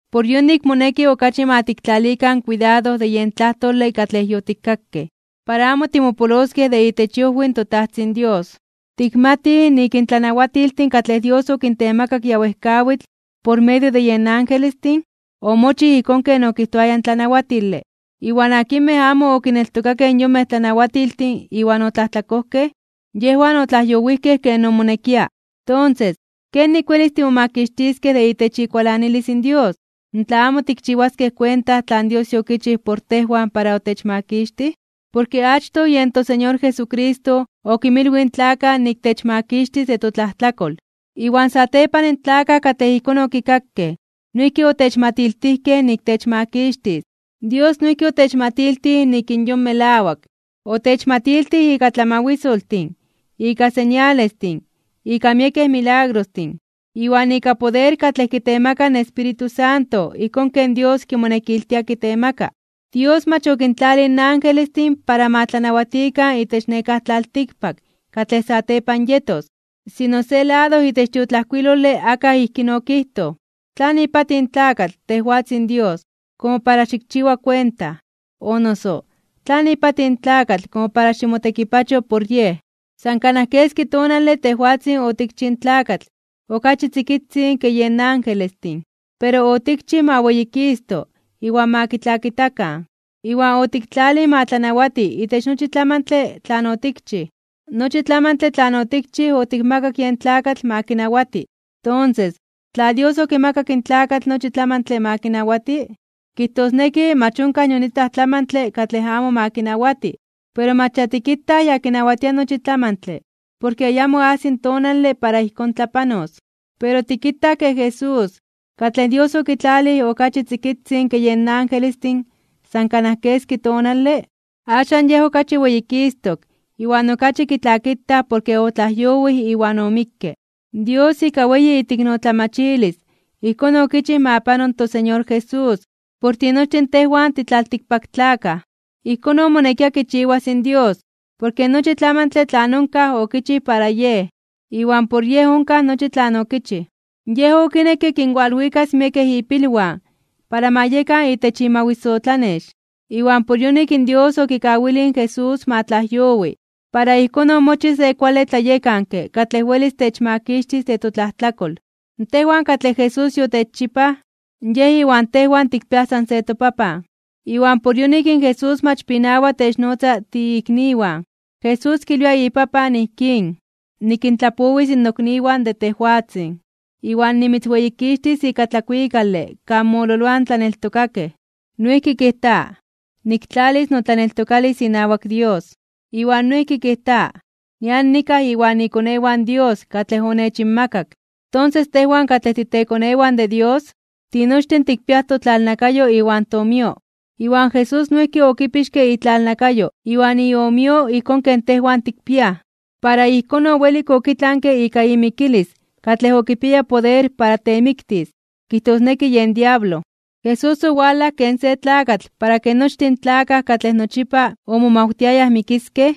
Por yonik moneki okachi ma tiktlalikan kuidado de yen tlajtole katlej yotikkakej, para amo timopoloskej de itech iojwi in toTajtzin Dios. Tikmatij nik in tlanawatiltin katlej Dios okintemakak ya wejkawitl por medio de yen angelestin omochij ijkón ken okijtoaya in tlanawatile, iwan akinmej amo okineltokakej in yonmej tlanawatiltin iwan otlajtlakojkej, yejwan otlajyowijkej ken omonekia. Tonses, ¿kenik welis timomakixtiskej de itech ikualanilis in Dios tla amo tikchiwaskej kuenta tlan Dios yokichij por tejwan para otechmakixtij? Porke achtoj yen toSeñor Jesucristo okinmilwij in tlakaj nik techmakixtis de totlajtlakol, iwan satepan in tlakaj katlej ijkón okikakej noijki otechmatiltijkej nik techmakixtis. Dios noijki otechmatiltij nik in yon melawak, otechmatiltij ika tlamawisoltin, ika señalestin, ika miekej milagrostin, iwan ika poder katlej kitemaka in Espíritu Santo ijkón ken Dios kimonekiltia kitemaka. Dios mach okintlalij in angelestin para ma tlanawatikan itech nekáj tlaltikpak katlej satepan yetos. Sino, se lado itech tiotlajkuilole akaj ijkín okijtoj: ¿Tlan ipatij in tlakatl, tejwatzin Dios, komo para xikchiwa kuenta? O noso, ¿tlan ipatij in tlakatl, komo para ximotekipachoj por yej? San kanaj keski tonale tejwatzin otikchij in tlakatl okachi tzikitzin ke yen angelestin. Pero otikchij ma weyikisto (weyitito) iwan ma kitlakitakan, iwan otiktlalij ma tlanawati itech nochi tlamantle tlan otikchij. Nochi tlamantle tlan otikchij otikmakak yen tlakatl ma kinawati. Tonses, tla Dios okimakak in tlakatl nochi tlamantle ma kinawati, kijtosneki mach onkaj nion itlaj tlamantle katlej amo ma kinawati. Pero mach ya tikitaj ya kinawatia nochi tlamantle porke ayamo ajsi in tonale para ijkón tlapanos. Pero tikitaj ke Jesús, katlej Dios okitlalij okachi tzikitzin ke yen angelestin san kanaj keski tonale, axan Yej okachi weyikistok (weyititok) iwan okachi kitlakitaj porke otlajyowij iwan omikke. Dios ika weyi iteiknotlamachilis ijkón okichij ma pano in toSeñor Jesús por tinochtin tejwan titlaltikpaktlakaj. Ijkón omonekia kichiwas in Dios, porke nochi tlamantle tlan onkaj okichij para Yej. Iwan por Yej onkaj nochi tlan okichij. Yej okinekke kinwalwikas miekej ipilwan para ma yekan itech imawisotlanex. Iwan por yonik Dios okikawilij in Jesús ma tlajyowi, para ijkón omochij se kuale tlayekanke katlej welis techmakixtis de totlajtlakol. Tejwan katlej Jesús yotechchipaj, Yej iwan tejwan tikpiaj san se toPapan. Iwan por yonik in Jesús mach pinawa de technotza tiikniwan. Jesús kilwia iPapan, ijkín: Nikintlapowis nokniwan de tejwatzin, iwan nimitzweyikixtis ika tlakuikale kan mololoaj in tlaneltokakej. Noijki kijta: Niktlalis notlaneltokalis inawak Dios. Iwan noijki kijta: Nian nikaj inwan ikonewan Dios katlej onechinmakak. Tonses, tejwan katlej titekonewan de Dios, tinochtin tikpiaj totlalnakayo iwan toomio. Iwan Jesús noijki okipixke itlalnakayo iwan iomio ijkón ken tejwan tikpiaj, para ijkón owelik okitlanke ika imikilis katlej okipiaya poder para temiktis, kijtosneki yen diablo. Jesús owalaj ken se tlakatl para ke nochtin in tlakaj katlej nochipa omomawtiayaj mikiskej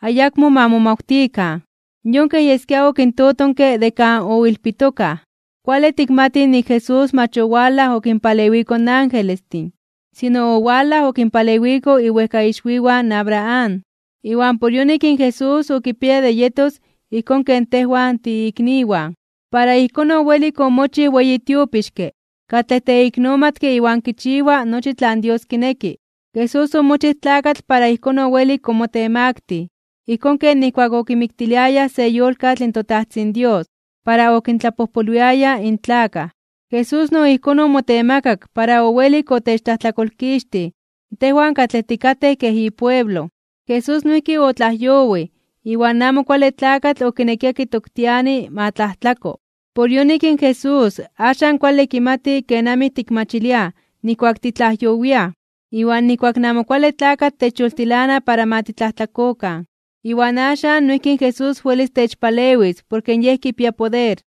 ayakmo ma momawtikan. Yon kej yeskia okintotonke de kan oilpitokaj. Kuale tikmatij nik in Jesús mach owalaj okinpalewiko in angelestin, sino owalaj okinpalewiko iwejkaixwiwan in Abraham. Iwan por yonik in Jesús okipiaya de yetos ijkón ken tejwan, tiikniwan. Para ijkón owelik omochij weyi tiopixke katlej teiknomatke iwan kichiwa nochi tlan Dios kineki. Jesús omochij tlakatl para ijkón owelik omotemaktij (omotemaktilij) ijkón ken nijkuak okimiktiliayaj se yolkatl in toTajtzin Dios para okintlapojpolwiaya in tlakaj, Jesús no ijkón omotemakak para owelik otechtlajtlakolkixtij tejwan katlej tikatej kej ipueblo. Jesús noijki otlajyowij iwan in Amo Kuale Tlakatl okinekia kitoktiani ma tlajtlako, por yonik in Jesús axan kuale kimati kenamij tikmachiliaj nijkuak titlajyowiaj iwan nijkuak in Amo Kuale Tlakatl techyoltilana para ma titlajtlakokan, iwan axan noijki in Jesús welis techpalewis porke Yej kipia poder.